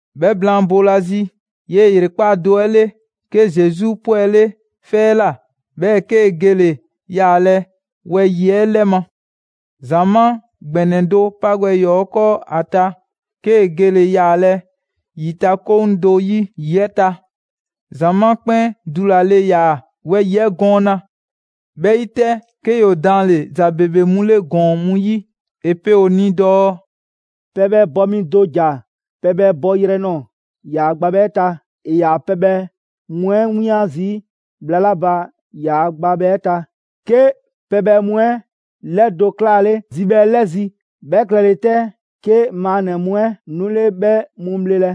'Bhɛ blaan boolazi, 'yee‑ ‑yrekpaa' do 'ɛ 'le, 'ke Zesu 'pwɛle 'fɛ 'ɛ ꞊la, 'bhɛɛ‑ 'kee‑ gele‑ yaalɛ wɛyi‑ 'ɛ 'lɛ ma. ‑Zamaa' ‑gbɛnɛ do 'pa gbɛ ‑yɔɔ' 'ɛ 'kɔɔ ‑a ta, 'kee‑ gele‑ yaalɛ ‑yitakoŋ do 'yi ‑yi 'ɛ ta. ‑Zamaa' 'kpɛn dulale ‑yaa wɛyi‑ 'ɛ gɔɔna. 'Bhɛ 'yi 'tɛ, 'ke ‑yoo daanle ‑za ‑bebe mu 'le ‑gɔɔn mu 'yi. ‑E pe ‑o ni dɔɔ: «Pɛbhɛ bɔ mi do ‑ja pɛbhɛ bɔyrɛ nɔɔ‑ ‑yaa gbabhɛ 'ɛ ta. ‑E ‑yaa pɛbhɛ mu 'ɛ 'wian zii' bhla 'la ba ‑yaa' gbabhɛ 'ɛ ta, 'ke pɛbhɛ mu 'ɛ 'lɛdo‑ 'klaale zibhɛ 'ɛ 'lɛzi‑. 'Bhɛ klɛle 'tɛ, 'ke maannɛ‑ mu 'ɛ 'nule 'bhɛ mu bhlelɛ.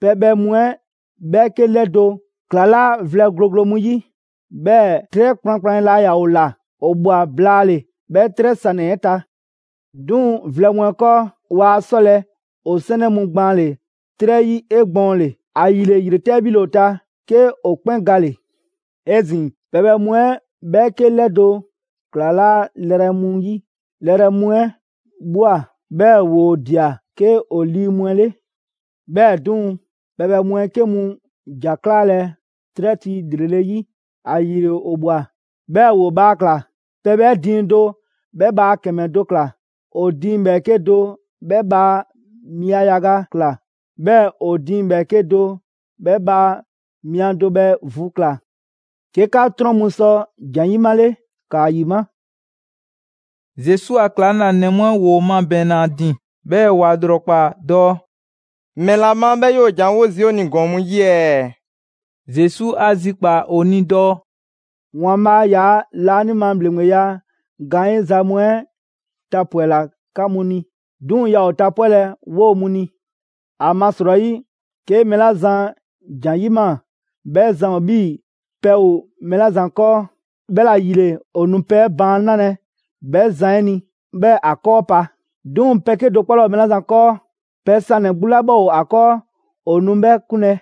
Pɛbhɛ mu 'ɛ 'bhɛɛke 'lɛdo‑ ‑klalaa' vlɛ gloglo mu 'yi, 'bhɛɛ‑ 'trɛ kplankplan laa ‑yaa ‑o ‑la. ‑O ꞊bhwa blaale‑ 'bhɛ 'trɛ sanɛ‑ 'ɛ ta. 'Duŋ‑ vlɛ mu 'ɛ 'kɔɔ, waa 'sɔlɛ‑ ‑o 'sɛnɛ mu gbaanle‑ 'trɛ 'yi 'egbɔɔnle. ‑Ayile ‑yretɛ' 'bhile‑ ‑o ta, 'ke ‑o 'kpɛn gale‑. 'Ezin‑, pɛbhɛ mu 'ɛ 'bhɛɛke 'lɛdo‑ ‑klalaa' lɛrɛ mu 'yi. Lɛrɛ mu 'ɛ ꞊bhwa, 'bhɛɛ‑ ‑woo ꞊dia 'ke ‑o lii mu 'ɛ 'le. 'Bhɛɛ‑ 'duŋ‑, pɛbhɛ mu 'ɛ 'ke mu ‑ja 'klaalɛ‑ 'trɛ ti ‑lrele' ‑yi. ‑Ayile ‑o ꞊bhwa, 'bhɛɛ‑ ‑woo bhaa ‑kla: pɛbhɛ 'ɛ diiŋ do 'bhɛ bhaa ‑kɛmɛ do ꞊kla, ‑o diiŋ ‑bhɛɛke' do 'bhɛ bhaa mia yaga ꞊kla, 'bhɛɛ‑ ‑o diiŋ ‑bhɛɛke' do 'bhɛ bhaa mia do bhɛ vu ꞊kla. 'Ke 'ka 'trɔn mu sɔ ‑jan 'yimale, ‑kaa ‑yima'!» Zesu a ‑klaŋlanɛ mu 'ɛ ‑woo mabɛɛnna ‑a ‑din, 'bhɛɛ‑ ‑wa ‑lrɔkpaa dɔɔ: «‑Mɛla ma 'bhɛɛ‑ 'yoo‑ ‑janwo' zii' ‑o ni ‑gɔɔn mu 'yi ɛɛ?» Zesu 'a zikpaa‑ ‑o ni dɔɔ: «‑Waanbhaa' 'yaa‑ laanima ‑bhleŋgbeya gaanyiza mu 'ɛ tapwɛla 'ka mu ni, 'duŋ‑ yaa ‑o tapwɛlɛ 'woo‑ mu ni. ‑Amasrɔyi, 'ke mɛɛ 'la zan ‑jan 'yima‑, 'bhɛ zan ‑o 'bhii‑ pɛ ‑o mɛɛ 'la zan 'kɔɔ, 'bhɛla‑ ‑yile ‑o nu pɛ baan' 'nalɛ‑ 'bhɛ zan 'ɛ ni, 'bhɛɛ‑ ‑a 'kɔɔ pa. 'Duŋ‑ pɛ 'kedo‑ 'kpɔ 'laa ‑o mɛɛ 'la zan 'kɔɔ, pɛ sanɛ‑ 'gbu 'la 'bhɛ ‑o ‑a 'kɔɔ, ‑o nu 'bhɛ 'kunlɛ‑.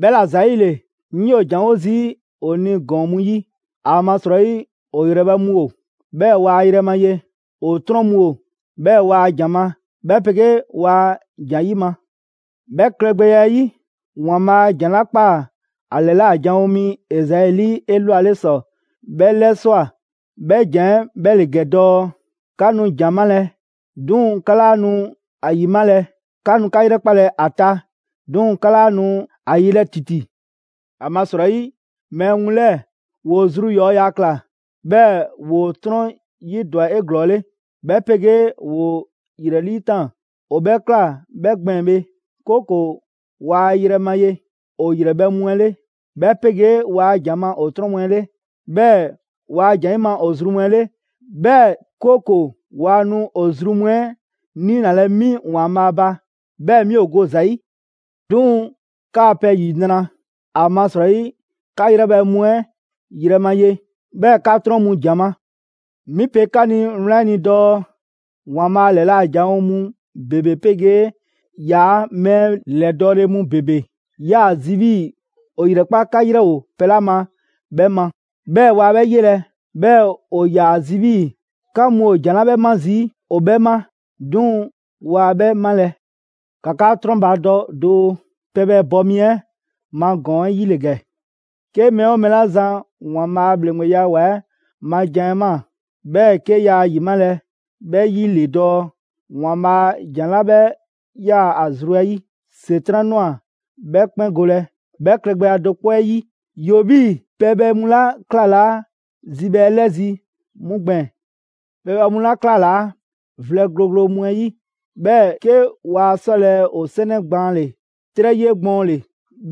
'Bhɛla‑ ‑zayile, 'ŋ 'yoo‑ ‑janwo' zii' ‑o ni ‑gɔɔn mu 'yi. ‑Amasrɔyi ‑o ‑yrɛbhɛ' mu ‑o, 'bhɛɛ‑ waa yrɛ ma ye, ‑o 'trɔn mu ‑o, 'bhɛɛ‑ waa ‑jan ma, 'bhɛ 'pegee waa ‑jan 'yima‑. 'Bhɛ klɛgbɛya 'ɛ 'yi, ‑Waanbhaa' ‑jan 'la ‑kpaa ‑a ‑lɛla' janwo mi Ezai 'lii 'elwale ‑sɔ 'bhɛ 'lɛswa꞊; 'bhɛ ‑jan 'ɛ 'bhɛ ‑le ‑gɛ dɔɔ: ‹'Ka nu ‑jan 'malɛ‑, 'duŋ‑ 'ka 'laa nu ‑a ‑yimalɛ; 'ka nu 'ka 'yrɛkpalɛ ‑a ta, 'duŋ‑ 'ka 'laa nu ‑a yelɛ ‑titi. ‑Amasrɔyi, mɛɛ mu 'lɛɛ‑ ‑woo zru ‑yɔɔya' ꞊kla, 'bhɛɛ‑ ‑woo 'trɔn 'yidwa‑ 'eglɔɔle, 'bhɛ 'pegee ‑woo ‑yrɛ 'liitaan‑, ‑o 'bhɛ ꞊kla 'bhɛ gbɛɛn‑ bhe, 'kooko‑ waa yrɛ ma ye ‑o ‑yrɛbhɛ' mu 'ɛ 'le, 'bhɛ 'pegee waa ‑jan ma ‑o 'trɔn mu 'ɛ 'le, 'bhɛɛ‑ waa ‑jan 'yima‑ ‑o zru mu 'ɛ 'le, 'bhɛɛ‑ 'kooko‑ waa nu ‑o zru mu 'ɛ 'niinalɛ 'mi ‑Waanbhaa' ba, 'bhɛɛ‑ 'mi ‑o go ‑za 'yi. «'Duŋ‑ 'kaa‑ pɛ ‑yinra', ‑amasrɔyi 'ka 'yrɛbhɛ‑ mu 'ɛ yrɛ ma ye, 'bhɛɛ‑ 'ka 'trɔn mu ‑jan ma. 'Mi pe 'ka ni wlan 'ɛ ni dɔɔ: ‑Waanbhaa' ‑lɛla' janwo mu ‑bebe 'pegee ‑yaa' mɛɛ ‑lɛdɔɔle mu ‑bebe 'yaa‑ zi 'bhii‑ ‑o ‑yrɛkpa' 'ka 'yrɛ ‑o pɛ 'la ma 'bhɛ ma, 'bhɛɛ‑ waa 'bhɛ 'yelɛ‑. 'Bhɛɛ‑ ‑o ‑yaa ‑a zi 'bhii‑ 'ka mu ‑o ‑jan 'la 'bhɛ 'ma zii' ‑o 'bhɛ 'ma, 'duŋ‑ waa 'bhɛ 'malɛ‑.» «‑Ka 'ka 'trɔnbadɔ doo, pɛbhɛ bɔ mi 'ɛ ma ‑gɔɔn 'ɛ 'yi ‑le ‑gɛ: 'Ke mɛɛ 'oo mɛɛ 'la zan ‑Waanbhaa' a ‑bhleŋgbeya ‑wa 'ɛ ma jan 'ɛ ꞊maa, 'bhɛɛ‑ 'ke yaa ‑yimalɛ, 'bhɛ 'yi ‑le dɔɔ ‑Waanbhaa' ‑jan 'la 'bhɛ 'yaa‑ ‑a zru 'ɛ 'yi, ‑Setran' ꞊nwa 'bhɛ 'kpɛn golɛ. 'Bhɛ klɛgbɛya do 'kpɔ 'ɛ 'yi, ‑yoo 'bhii‑ pɛbhɛ mu 'la 'klalaa zibhɛ 'ɛ 'lɛzi‑ 'mu gbɛɛn‑. Pɛbhɛ mu 'la 'klalaa‑ vlɛ gloglo mu 'ɛ 'yi, 'bhɛɛ‑ 'ke waa 'sɔlɛ‑ ‑o 'sɛnɛ gbaanle‑ 'trɛ 'yi 'egbɔɔnle,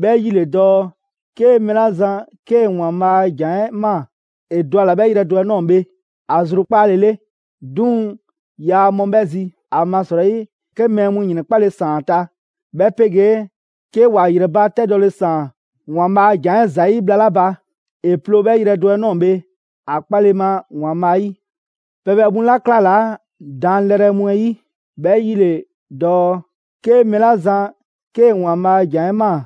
'bhɛ 'yi ‑le dɔɔ 'ke mɛɛ 'la zan 'kee‑ ‑Waanbhaa' a ‑jan 'ɛ ꞊maa, ‑e dɔ ‑a ‑la 'bhɛ yrɛ do 'ɛ ꞊nɔɔ bhe ‑a zrukpaale 'le. 'Duŋ‑ yaa mɔ 'bhɛ zi. ‑Amasrɔyi, 'ke mɛɛ mu ‑yrɛnkpale ‑saan ‑a ta, 'bhɛ 'pegee 'ke ‑wa ‑yrɛbatɛdɔle ‑saan ‑Waanbhaa' a ‑jan 'ɛ ‑zayi' bhla 'la ba, ‑e ploo 'bhɛ yrɛ do 'ɛ ꞊nɔɔ bhe ‑a 'kpale ma ‑Waanbhaa' 'yi. Pɛbhɛ mu 'la 'klalaa‑ daanlɛrɛ mu 'ɛ 'yi, 'bhɛ 'yi ‑le dɔɔ 'ke mɛɛ 'la zan 'kee‑ ‑Waanbhaa' a ‑jan 'ɛ ꞊maa,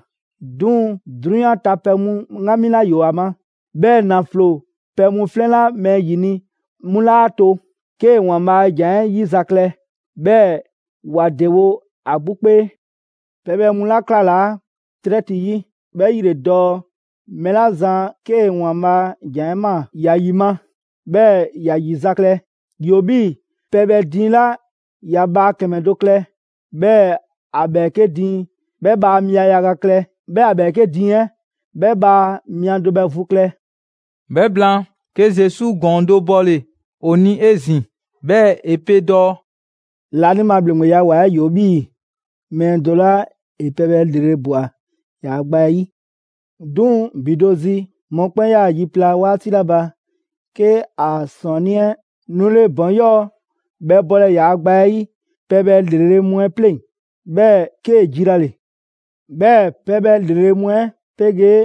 'duŋ‑ 'drunyan ta pɛ mu 'ŋgami 'la ‑yoo ‑a ma, 'bhɛɛ‑ ‑naflo pɛ mu 'flɛn 'la mɛɛ ‑yini' 'mu 'laa to 'kee‑ ‑Waanbhaa' a ‑jan 'ɛ 'yizaklɛ, 'bhɛɛ‑ ‑wa ‑dewo' ‑a 'gbu 'kpee. Pɛbhɛ mu 'la 'klalaa‑ 'trɛ ti 'yi, 'bhɛ 'yi ‑le dɔɔ mɛɛ 'la zan 'kee‑ ‑Waanbhaa' ‑jan 'ɛ ꞊maa, ‑ya ‑yima', 'bhɛɛ‑ ‑ya ‑yizaklɛ. ‑Yoo 'bhii‑ pɛbhɛ diiŋ 'la ‑ya bhaa ‑kɛmɛ do klɛ, 'bhɛɛ‑ ‑a ‑bhɛɛke' diiŋ 'bhɛ bhaa mia yaga klɛ, 'bhɛɛ‑ ‑a ‑bhɛɛke' diiŋ 'ɛ 'bhɛ bhaa mia do bhɛ vu klɛ.» 'Bhɛ blaan, 'ke Zesu ‑gɔɔn do bɔle‑ ‑o ni 'ezin‑, 'bhɛɛ‑ ‑e pe dɔɔ: «Laanima ‑Bhleŋgbeya ‑wa 'ɛ ‑yoo 'bhii‑ mɛɛ do 'la ‑e pɛbhɛ ‑lrele' ꞊bwa ‑yaa' gba 'ɛ 'yi. 'Duŋ‑ ‑bi do zi mɔkpɛn' 'yaa‑ yi pla 'waati 'la ba, 'ke ‑a ‑sɔɔnnii' 'ɛ 'nule ‑bɔn 'yɔɔ‑ bhɛ bɔlɛ ‑yaa' gba 'ɛ 'yi pɛbhɛ ‑lrele' mu 'ɛ 'pleŋ‑, 'bhɛɛ‑ 'kee‑ jilale. 'Bhɛɛ‑ pɛbhɛ ‑lrele' mu 'ɛ 'pegee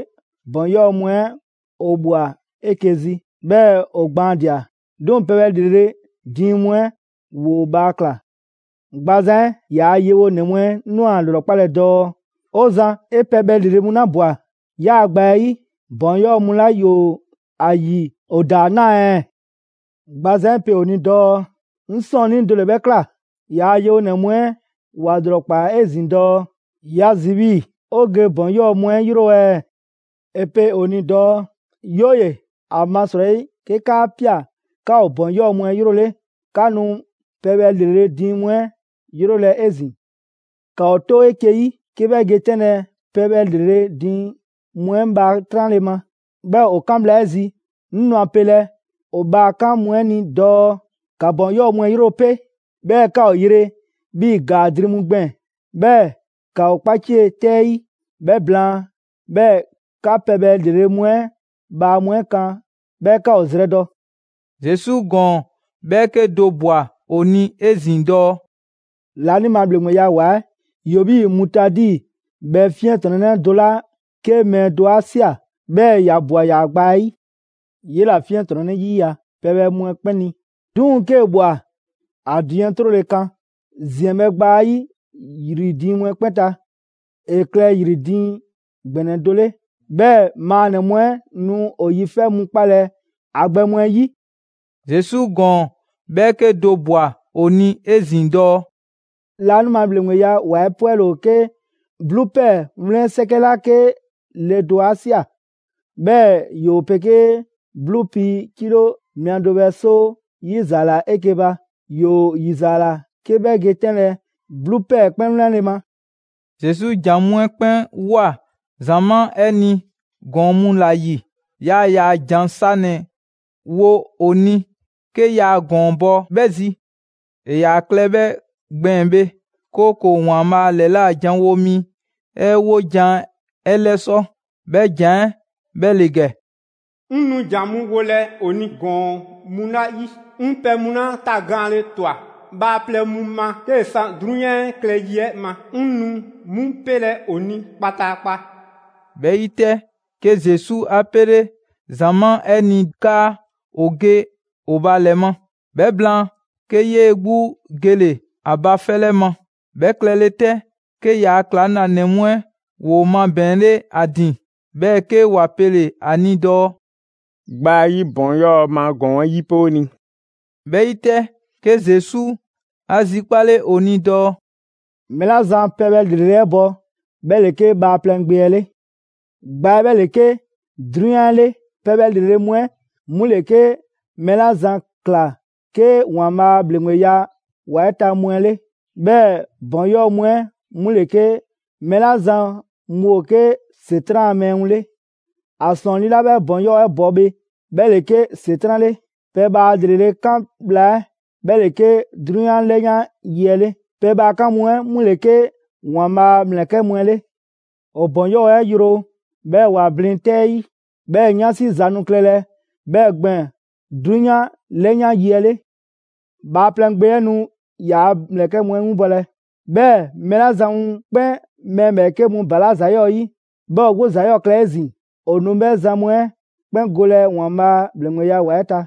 ‑bɔn 'yɔɔ‑ mu 'ɛ ‑o ꞊bhwa 'eke‑ zi, 'bhɛɛ‑ ‑o gbaandia‑. 'Duŋ‑ pɛbhɛ ‑lrele' diiŋ mu 'ɛ ‑woo bhaa ꞊kla. Gbazan 'ɛ ‑yaa' yewonɛ mu 'ɛ ꞊nwa ‑a ‑lrɔkpalɛ dɔɔ: ‹‑O Zan, 'e pɛbhɛ ‑lrele' mu ‑la ꞊bwa 'yaa‑ gba 'ɛ 'yi, ‑bɔn 'yɔɔ‑ mu 'la ‑woo ‑a ‑yi ‑o ‑daa 'naa ɛɛ?› Gbazan 'ɛ pe ‑o ni dɔɔ: ‹'Ŋ 'sɔɔnnii do ‑le 'bhɛ ꞊kla.› ‑Yaa' yewonɛ mu 'ɛ ‑wa ‑lrɔkpaa 'ezin‑ dɔɔ: ‹꞊Ya zi 'bhii‑ 'o ge ‑bɔn 'yɔɔ‑ mu 'ɛ 'yro ɛɛ?› ‑E pe ‑o ni dɔɔ: ‹'Yooye‑, ‑amasrɔyi 'ke 'kaa ꞊pia 'ka ‑o ‑bɔn 'yɔɔ‑ mu 'ɛ 'yrole, 'ka nu pɛbhɛ ‑lrele' diiŋ mu 'ɛ 'yrolɛ‑ 'ezin‑. ‑Ka ‑o 'to 'eke‑ 'yi 'ke 'bhɛ ge 'tɛnlɛ‑ pɛbhɛ ‑lrele' diiŋ mu 'ɛ bhaa 'tranle‑ ma. 'Bhɛɛ‑ ‑o 'kan bhla 'ɛ zi, 'ŋ nu a pelɛ ‑o bhaa 'kan mu 'ɛ ni dɔɔ: ‑Ka ‑bɔn 'yɔɔ‑ mu 'ɛ yro 'pe, 'bhɛɛ‑ ‑ka ‑o yre 'bhii‑ ‑gaa dri mu gbɛɛn‑, 'bhɛɛ‑ ‑ka ‑o kpacie 'tɛ 'yi. 'Bhɛ blaan, 'bhɛɛ‑ 'ka pɛbhɛ ‑lrele' mu 'ɛ bhaa mu 'ɛ kan 'bhɛɛ‑ 'ka ‑o zrɛdɔ.›» Zesu ‑gɔɔn 'bhɛɛke do ꞊bwa ‑o ni 'ezin‑ dɔɔ: «Laanima ‑Bhleŋgbeya ‑wa 'ɛ ‑yoo 'bhii‑ mutaadi 'bhɛ 'fiɛntrɔnnɛ do 'la 'ke mɛɛ do 'a ꞊sia, 'bhɛɛ‑ ‑ya ꞊bwa ‑yaa' gba 'ɛ 'yi. 'Yela‑ 'fiɛntrɔnnɛ 'yiya‑ pɛbhɛ mu 'ɛ 'kpɛn ni; 'duŋ‑ 'kee‑ ꞊bhwa, ‑a diiŋ 'ɛ 'trole‑ kan ‑ziɛnbhɛ' gba 'ɛ 'yi ‑yri diiŋ mu 'ɛ 'kpɛn ta, ‑e klɛ ‑yri diiŋ ‑gbɛnɛ do 'le. 'Bhɛɛ‑ maannɛ‑ mu 'ɛ nu ‑o yifɛ' mu 'kpalɛ‑ ‑a gbɛ mu 'ɛ 'yi.» Zesu ‑gɔɔn 'bhɛɛke do ꞊bwa ‑o ni 'ezin‑ dɔɔ: «Laanima ‑Bhleŋgbeya ‑wa 'ɛ 'pwɛle‑ ‑o 'ke 'bluu ‑pɛɛ wlɛn 'sɛkɛ 'la 'ke le do 'a ꞊sia, 'bhɛɛ‑ ‑yoo 'pegee 'bluu pii kilo mia do bhɛ 'soo 'yizaala 'eke‑ ba. ‑Yoo ‑yizaala 'ke 'bhɛ ge 'tɛnlɛ‑ 'bluu ‑pɛɛ 'ɛ 'kpɛn 'wlɛnle‑ ma.» Zesu ‑jan mu 'ɛ 'kpɛn ꞊woa ‑zamaa' 'ɛ ni ‑gɔɔn mu ‑la ‑yi. Yaa ‑yaa ‑jan sanɛ‑ wo ‑o ni 'ke yaa ‑gɔɔn bɔ 'bhɛ zi. ‑E ‑yaa klɛ 'bhɛ gbɛɛn‑ bhe, 'kooko‑ ‑Waanbhaa' ‑lɛla' janwo mi 'ɛ 'wojan‑ 'ɛ 'lɛsɔ‑; 'bhɛ ‑jan 'ɛ 'bhɛ ‑le ‑gɛ: «'Ŋ nu ‑jan mu wolɛ ‑o ni ‑gɔɔn mu ‑la ‑yi, 'ŋ pɛ mu 'la tagaanle ꞊twa bhaaplɛŋ mu ma 'kee‑ 'san 'drunyan klɛ yi 'ɛ ma, 'ŋ nu 'mu 'pelɛ‑ ‑o ni kpataakpa.» 'Bhɛ 'yi bhe, 'ke Zesu a 'pele ‑zamaa' 'ɛ ni 'kaa ‑o ge ‑o ba ‑lɛ ma. 'Bhɛ blaan, 'ke 'yee‑ 'gbu gele‑ ‑a ba 'fɛ 'lɛ ma. 'Bhɛ klɛle 'tɛ, 'ke ‑yaa' ‑klaŋlanɛ mu 'ɛ ‑woo mabɛɛnle 'a ‑din, 'bhɛɛ‑ 'ke ‑wa pele‑ ‑a ni dɔɔ: «Gba 'ɛ 'yi ‑bɔn 'yɔɔ‑ ma ‑gɔɔn 'ɛ 'yipe 'o ni.» 'Bhɛ 'yi 'tɛ, 'ke Zesu 'a zikpale ‑o ni dɔɔ: «Mɛɛ 'la zan pɛbhɛ ‑lrele' 'ɛ bɔ, 'bhɛ ‑le 'ke Bhaaplɛŋ Gbe 'ɛ 'le; Gba 'ɛ 'bhɛ ‑le 'ke 'drunyan 'ɛ 'le; pɛbhɛ ‑lrele' mu 'ɛ 'mu ‑le 'ke mɛɛ 'la zan ꞊kla 'ke ‑Waanbhaa' a ‑bhleŋgbeya ‑wa 'ɛ ta mu 'ɛ 'le; 'bhɛɛ‑ ‑bɔn 'yɔɔ‑ mu 'ɛ 'mu ‑le 'ke mɛɛ 'la zan mu ‑o 'ke ‑Setran' ‑a mɛɛ mu 'le; ‑a ‑sɔɔnnii' 'la 'bhɛ ‑bɔn 'yɔɔ‑ 'ɛ bɔ bhe, 'bhɛ ‑le 'ke ‑Setran' 'le; pɛbhaa ‑lrele' 'kan bhla 'ɛ, 'bhɛ ‑le 'ke 'drunyan 'lɛyan yi 'ɛ 'le; pɛbhaa 'kan mu 'ɛ 'mu ‑le 'ke ‑Waanbhaa' a ‑mlɛkɛ' mu 'ɛ 'le. ‑O ‑bɔn 'yɔɔ‑ 'ɛ yro, 'bhɛɛ‑ ‑wa blin 'tɛ 'ɛ 'yi; 'bhɛɛ‑ 'yansi za nu klɛlɛ 'bhɛɛ‑ gbɛɛn‑ 'drunyan 'lɛyan yi 'ɛ 'le. Bhaaplɛŋ Gbe 'ɛ nu ‑yaa' ‑mlɛkɛ' mu 'ɛ 'winbɔlɛ, 'bhɛɛ‑ mɛɛ 'la zan mu 'kpɛn mɛɛ ‑bhɛɛke' mu balaa' ‑za 'yɔɔ‑ 'yi, 'bhɛɛ‑ ‑o 'gbu ‑za 'yɔɔ‑ klɛ 'ezin‑, ‑o nu 'bhɛ zan mu 'ɛ 'kpɛn golɛ ‑Waanbhaa' ‑bhleŋgbeya ‑wa 'ɛ ta.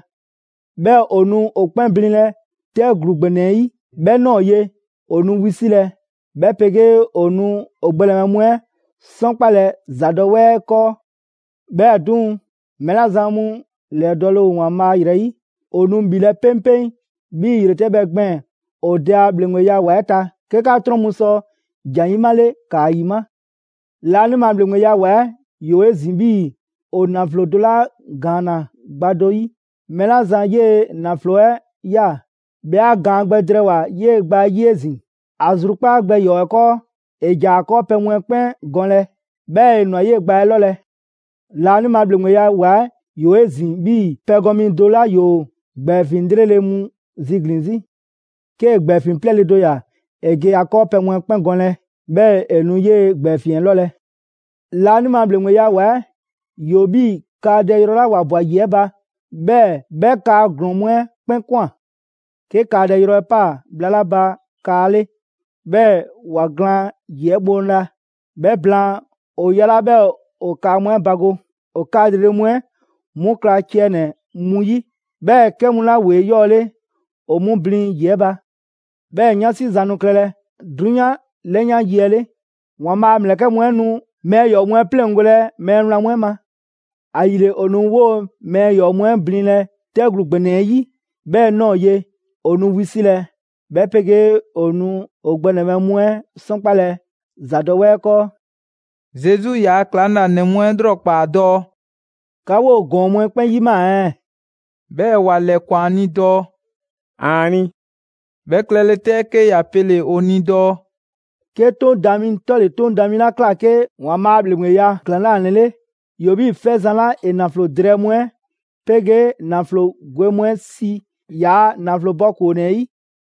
'Bhɛɛ‑ ‑o nu ‑o 'kpɛn blinlɛ 'tɛ ‑gluu ‑gbɛnɛ 'ɛ 'yi. 'Bhɛ ꞊nɔɔ ye, ‑o nu wisilɛ, 'bhɛ 'pegee ‑o nu ‑o gbɛnɛbhɛ mu 'ɛ 'sɔnkpalɛ ‑ ‑zadɔwɛɛ 'ɛ 'kɔɔ.» 'Bhɛɛ‑ 'duŋ‑, mɛɛ 'la zan mu ‑lɛdɔɔle ‑o ‑Waanbhaa' ‑yrɛ 'yi, ‑o nu ‑bhilɛ' 'peŋpeŋ 'bhii‑ ‑yretɛbhɛ gbɛɛn‑ ‑o Dɛ a ‑bhleŋgbeya ‑wa 'ɛ ta. 'Ke 'ka 'trɔn mu sɔ ‑jan 'yi 'male ‑kaa ‑yima'. «Laanima ‑Bhleŋgbeya 'ɛ ‑wa ‑yoo 'ezin‑ 'bhii‑ ‑o ‑naflo do 'la ‑gaanna gba do 'yi. Mɛɛ 'la zan 'yee‑ ‑naflo 'ɛ ꞊ya, 'bhɛ 'a gaan gbɛ drɛɛwoa‑ 'yee‑ gba 'ɛ 'yi 'ezin‑. ‑A zrukpaa' gbɛ ‑yɔɔ 'ɛ 'kɔɔ, ‑e ‑ja ‑a 'kɔɔpɛ‑ mu 'ɛ 'kpɛn gɔnlɛ, 'bhɛɛ‑ ‑e ‑nwa 'yee‑ gba 'ɛ 'lɔlɛ‑.» «Laanima ‑Bhleŋgbeya ‑wa 'ɛ 'yoo‑ 'ezin‑ 'bhii‑ pɛgɔn mi do 'la ‑yoo ‑gbɛɛfiŋ 'lrele‑ mu ziglin‑ 'zi. 'Kee‑ ‑gbɛɛfiŋ 'plɛɛle‑ do ‑ya, ‑e ge ‑a 'kɔɔpɛ‑ mu 'ɛ 'kpɛn gɔnlɛ, 'bhɛɛ‑ ‑e nu 'yee‑ ‑gbɛɛfiŋ 'ɛ 'lɔlɛ‑.» «Laanima ‑Bhleŋgbeya ‑wa 'ɛ ‑yoo 'bhii‑ kaadɛ yrɔ 'la ‑wa ꞊bwa ‑yi 'ɛ ba; 'bhɛɛ‑ 'bhɛ kaa ‑glɔɔn mu 'ɛ 'kpɛn ꞊kwan‑. 'Ke kaadɛ yrɔ 'ɛ 'paa‑ bhla 'la ba kaa 'le, 'bhɛɛ‑ ‑wa glaan ‑yi 'ɛ bhoŋla. 'Bhɛ blaan, ‑o yalaa' 'bhɛɛ‑ ‑o kaa mu 'ɛ bago: ‑O kaa ‑lrele' mu 'ɛ 'mu kla ciɛ ‑nɛ mu 'yi, 'bhɛɛ‑ 'kɛ mu 'la ‑woo 'eyɔɔle, ‑o 'mu blin ‑yi 'ɛ ba. 'Bhɛɛ‑ 'yansi ‑za nu klɛlɛ 'drunyan 'lɛyan yi 'ɛ 'le. ‑Waanbhaa' a ‑mlɛkɛ' mu 'ɛ nu mɛɛ ‑yɔɔ' mu 'ɛ 'pleŋgolɛ mɛɛ wlan mu 'ɛ ma. ‑Ayile, ‑o nu 'woo‑ mɛɛ ‑yɔɔ' mu 'ɛ blinlɛ 'tɛ ‑gluu ‑gbɛnɛ 'ɛ 'yi. 'Bhɛ ꞊nɔɔ ye, ‑o nu wisilɛ, 'bhɛ 'pegee ‑o nu ‑o gbɛnɛbhɛ mu 'ɛ 'sɔnkpalɛ ‑ ‑zadɔwɛɛ 'ɛ 'kɔɔ.» Zesu ‑yaa' ‑klaŋlanɛ mu 'ɛ ꞊lrɔkpaa' dɔɔ: «'Ka 'woo‑ ‑gɔɔn mu 'ɛ 'kpɛn 'yimaa‑ ɛɛ?» 'Bhɛɛ‑ ‑wa ‑lɛkwan ‑a ni dɔɔ: «‑Aani'!» 'Bhɛ klɛle 'tɛ, 'ke ‑ya pele‑ ‑o ni dɔɔ: «'Ke 'Toŋ daan mi 'tɔle‑ 'Toŋ daan mi 'la ꞊kla 'ke ‑Waanbhaa' a ‑bhleŋgbeya ‑klaŋlanɛ 'le, ‑yoo 'bhii‑ 'fɛzan‑ 'la ‑e ‑naflo drɛɛ mu 'ɛ 'pegee ‑naflo gwe mu 'ɛ si ‑yaa' ‑naflo bɔ ‑koonɛ 'ɛ 'yi.»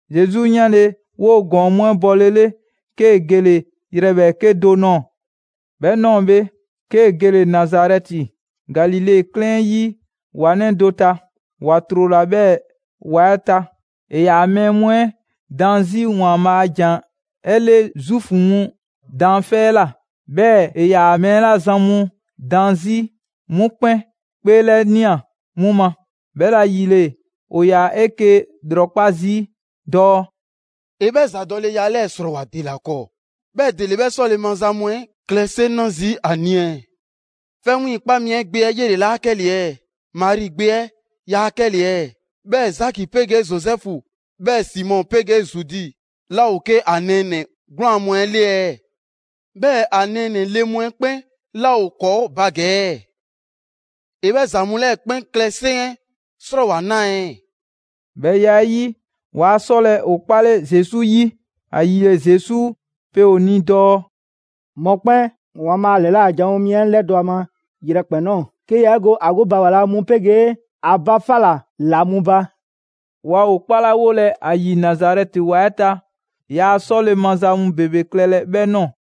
Zesu 'yanle‑ 'woo‑ ‑gɔɔn mu 'ɛ bɔlele, 'kee‑ gele‑ yrɛ ‑bhɛɛke' do nɔɔ‑. 'Bhɛ 'nɔɔ‑ bhe, 'kee‑ gele‑ Nazarɛti, Galile 'klɛɛn 'yi ‑wa 'nɛ do ta, ‑wa ‑trola 'bhɛɛ‑ ‑wa 'ɛ ta. ‑E ‑yaa mɛɛ mu 'ɛ daan 'zi ‑Waanbhaa' a ‑jan 'ɛ 'le Zuufu mu daanfɛ' 'ɛ ꞊la. 'Bhɛɛ‑ ‑e ‑yaa mɛɛ 'la zan mu daan 'zi 'mu 'kpɛn 'kpeelɛnia 'mu ma. 'Bhɛla‑ ‑yile, ‑o ‑yaa 'eke‑ ‑lrɔkpa' zii' dɔɔ: «‑E 'bhɛ ‑zadɔleya 'lɛɛ‑ 'ɛ 'srɔɔwoa‑ ‑dela 'kɔɔ, 'bhɛɛ‑ ‑dele 'bhɛ 'sɔle‑ maza mu 'ɛ klɛ 'seŋ 'na zii' ‑a ni ɛɛ? 'Fɛ 'wiiŋkpa mi 'ɛ gbe 'ɛ 'yele‑ 'laa 'kɛle‑ ɛɛ? Mari gbe 'ɛ yaa 'kɛle‑ ɛɛ? 'Bhɛɛ‑ Zaki 'pegee Zozɛfu, 'bhɛɛ‑ Simɔ 'pegee Zudi 'laa ‑o 'ke ‑a nɛɛnɛ‑ 'gwlaan‑ mu 'ɛ 'le ɛɛ? 'Bhɛɛ‑ ‑a nɛɛnɛ‑ le mu 'ɛ 'kpɛn 'laa ‑o ‑kɔɔ' ba ‑gɛ ɛɛ? ‑E 'bhɛ ‑za mu 'lɛɛ‑ 'kpɛn klɛ 'seŋ 'ɛ 'srɔɔwoa‑ 'naa ɛɛ?» 'Bhɛ ya 'ɛ 'yi, waa 'sɔlɛ‑ ‑o 'kpale Zesu 'yi. ‑Ayile Zesu pe ‑o ni dɔɔ: «Mɔkpɛn' ‑Waanbhaa' ‑lɛla' janwo mi 'ɛ 'lɛdɔ‑ ‑a ma yrɛkpɛn‑ ꞊nɔɔ, 'ke yaa 'e go ‑a 'gbu ba ‑wa la mu 'pegee ‑a ba 'fa ꞊la ‑la mu ba.» Waa ‑o 'kpalawolɛ ‑a ‑yi Nazarɛti ‑wa 'ɛ ta, yaa 'sɔle‑ maza mu ‑bebe klɛle‑ 'bhɛ ꞊nɔɔ.